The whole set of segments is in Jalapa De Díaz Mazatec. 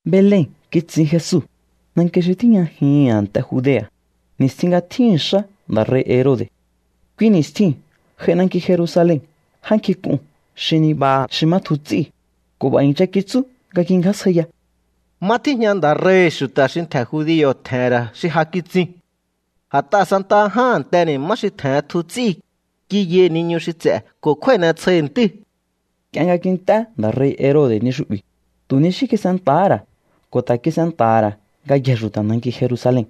Belen kitsin Jesu, nanki xi tíjñajihi̱n a̱nte Judea̱, ni̱stjin nga tjíhi̱n xá nda̱ rei̱ Herode̱. Kui ni̱stjiu̱n j'ai nanki Jerusalen já nkjink'un xi nibaha xi má tjuhu ts'íu̱ ko̱ b'a̱ i̱ncha kitsú nga kingjásjaiya: —¿Má tíjña nda̱ rei̱hi̱ xu̱ta̱ xi ntje̱ judio̱ tje̱he̱n ra̱ xi ja kitsiu̱n? A̱t'aha̱ santaha ján a̱nteni̱ má xi tje̱hen tju ts'íu̱, kiyai̱ niñu xi ts'e̱ ko̱ kjúái̱ n'etsjoi̱hi̱ ntíu̱. Nk'ie nga kint'é nda̱ rei̱ Herode̱ ni xu'bi̱, tu̱ ni xí kis'enta̱há ra̱ ko̱ ta̱ kis'enta̱ha̱ ra̱ ngayjee̱ xu̱ta̱ nanki Jerusalen.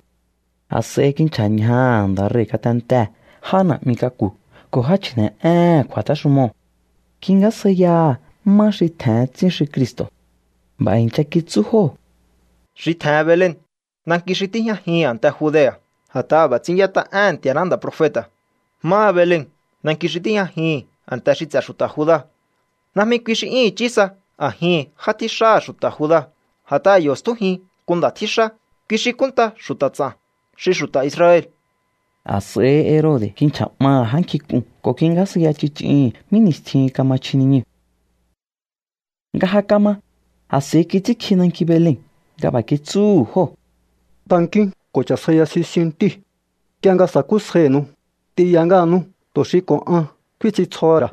A̱s'a̱i kinchja̱ ñjaha̱ nda̱ rei̱ ngatentee̱ já na̱'mi k'aku̱ ko̱ já chji̱ne̱'éhe̱n kju̱a̱téxumoo̱. Kingjásjaiyaha̱ má xi tje̱hen tsín xi Cristo̱. B'a̱ i̱ncha kitsú jóo̱: —Xi tje̱hen Belen, nanki xi tíjñajihi̱n a̱nte Judea̱. A̱t'aha̱ b'a̱ ts'ín y'ét'a éhe̱n Nti̱a̱ná nda̱ profeta̱: Máha Belen, nanki xi tíjñajihi̱n a̱nte xi ts'e̱ xu̱ta̱ Juda̱, najmi kui xi 'yún i̱chí sa a̱jihi̱n já tjíxáha̱ xu̱ta̱ Juda̱. A̱t'aha̱ yo̱ stjújin nku nda̱ tjíxá kui xi kúnnta xu̱ta̱ ts'a̱n xi xu̱ta̱ Israel. A̱s'a̱i Herode̱ kinchja̱ 'maha̱ já nkjink'uu̱n ko̱ kingjásjaiya ch'ich'ihi̱n mí ni̱stjihin kama chji niñuu̱. Nga ja kama, a̱s'a̱i kits'ínkji nanki Belen nga b'a̱ kitsúhu̱ jóo̱: —Tankíún ko̱ cha̱sjaiya sisiun ntíu̱. Nk'ie nga sa̱kúsjainu̱u, t'inya ngáhanú tu̱ xi ko̱ an kfín ts'intsjoho̱ ra̱.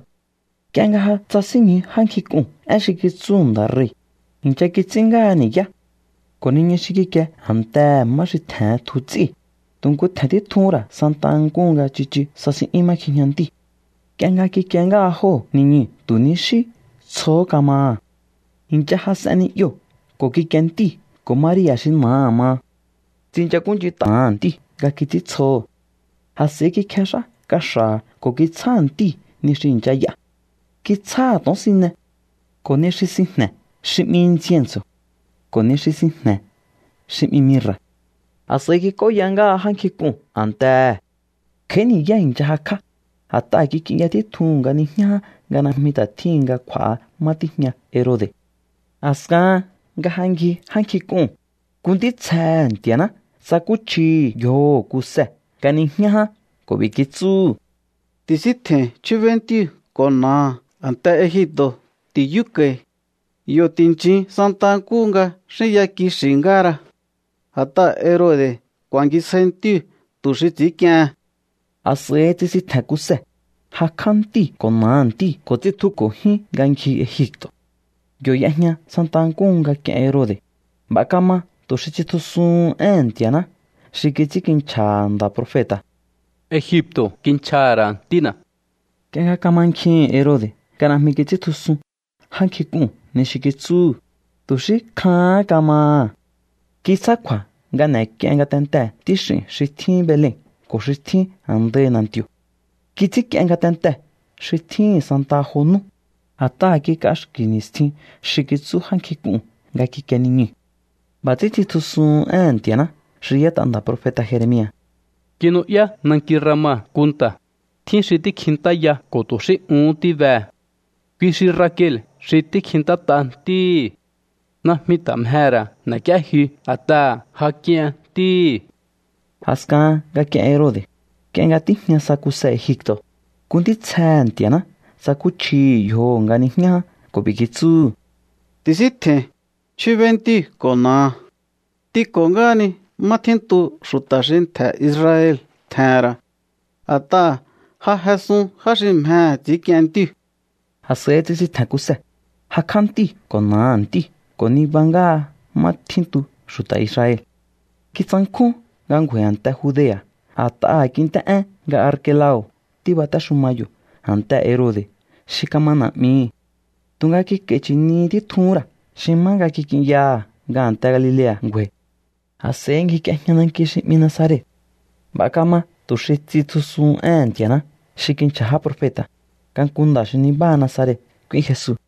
Nk'ie nga ja tsasínñju já nkjink'uu̱n én xi kitsú nda̱ rei̱, i̱ncha kits'ín ngáha ni̱yá. Ko̱ niñu xi kikie a̱ntehe̱ má xi tje̱hen tju ts'íu̱, tu̱ nku tje̱n títjuhún ra̱ santa nkúhu nga tsichu sasin'yún má kjijña ntíu̱. Nk'ie nga kikie ngáha jóo̱ niñuu̱, tu̱ ni xí tsjohó kamaha̱. I̱ncha jas'en ni'yoo̱ ko̱ kikie ntíu̱ ko̱ Maria̱ xi na̱aha̱ maha. Tsinchakúnch'int'aha̱ ntíu̱ nga kits'íntsjoho̱. A̱s'a̱i kikjex'á kaxa̱ha̱ ko̱ kitsjáha̱ ntíu̱ ni xi i̱ncha y'a. Kitsjáha̱ to̱onsine, ko̱ ni xi sinjne̱ xi 'mi incienso̱, ko̱ ni xi sinjne̱ xi 'mi mirra̱. A̱s'a̱i kik'óya ngáha já nkjink'uu̱n a̱ntehe̱. Kj'a̱í ni̱yá i̱ncha jakj'á, a̱t'aha̱ kik'inya títjuhu̱n nga niñjá ján nga najmi ta̱ tjíhin nga kj'u̱a̱ha má tíjña Herode̱. A̱skahan nga ja ngji já nkjink'uu̱n, nku ntítsjehe̱ Nti̱a̱ná tsakúchjihi̱ yjoho̱ Kuse nga nijñá ján ko̱ b'i̱ kitsúhu̱: —Ti̱síntje̱i̱n, chjúbéí ntíu̱ ko̱ na̱aha̱. A̱nte Egipto̱ ti̱yúko̱i̱. Yo̱ ti̱nchin santa nkúhu nga xínya kixi̱ ngáhara. A̱t'aha̱ Herode̱ ku̱a̱ngisjai ntíu̱ tu̱ xi ts'i̱ínk'iehen. A̱s'a̱i tsisintje̱n Kuse, jakj'á ntíu̱ ko̱ na̱aha̱ ntíu̱ ko̱ tsitjuko̱ jyún nga ngji Egipto̱. Yo̱ y'ejña santa nkúhu nga k'ien Herode̱. B'a̱ kama tu̱ xi tsitjusuhun éhe̱n Nti̱a̱ná xi kits'ínkinchja̱ha̱ nda̱ profeta̱: “Egipto̱ kinchjaha̱ ra̱ Ntína̱.” Nk'ie nga kamankjihi̱n Herode̱ nga najmi kits'íntjusun já nkjink'uu̱n ni xi kitsúhu̱, tu̱ xí kjahán kamaha̱. Kitsjá kju̱a̱ nga n'e̱k'ien ngatentee̱ ntíx'i̱n xi tjín Belen ko̱ xi tjín a̱ndai na̱nti̱o̱. Kits'ínk'ien ngatentee̱ xi tjíhi̱n santaha jo nú, a̱t'aha̱ kik'axki̱ ni̱stjin xi kitsú já nkjink'uu̱n nga kikie niñuu̱. B'a̱ ts'ín tsitjusuhun éhe̱n Nti̱a̱ná xi y'ét'a nda̱ profeta̱ Jeremia̱: Kinu'yá nanki Rama nku nta̱, tjín xi tíkjintáya ko̱ tu̱ xí uhún tíbehe̱. Kui xi Rakel xi tíkjintát'a ntíhi̱. Najmi ta̱ mjehe̱ ra̱ n'e̱k'íéjyu a̱t'aha̱ ja k'ien ntíhi̱. A̱skahan nga k'ien Herode̱, nk'ie nga tíjña sa Kuse Egipto̱, nku ntítsjehe̱ Nti̱a̱ná tsakúchjihi̱ yjoho̱ nga nijñá ján ko̱ b'i̱ kitsúhu̱: —Ti̱síntje̱i̱n, chjúbéí ntíu̱ ko̱ na̱aha̱. T'inko̱ ngáhani má tjíntu xu̱ta̱ xi ntje̱ Israel tje̱he̱n ra̱. A̱t'aha̱ ja jesun já xi mjehe̱ ts'i̱ínk'ien ntíu̱. A̱s'a̱i tsisintje̱n Kuse, jakj'á ntíu̱ ko̱ na̱aha̱ ntíu̱ ko̱ niba ngáha má tjíntu xu̱ta̱ Israel. Kitsankjún nga ngju̱a̱i̱ a̱nte Judea̱ a̱t'aha̱ kint'é én nga Arkelao̱ tíbatéxuma yo̱ a̱ntehe̱ Herode̱ xi kama na̱'mihi̱. Tu̱nga kik'a̱i̱ chi̱ni títjuhún ra̱ xi má nga kik'inyaha̱ nga a̱nte Galilea̱ ngju̱a̱i̱. A̱s'a̱i ngjik'iejña nanki xi 'mi Nazaret. B'a̱ kama tu̱ xi tsitjusuhun éhe̱n Nti̱a̱ná xi kinchja̱ já profeta̱, nga nku nda̱ xi nibáha Nazaret k'úín Jesu.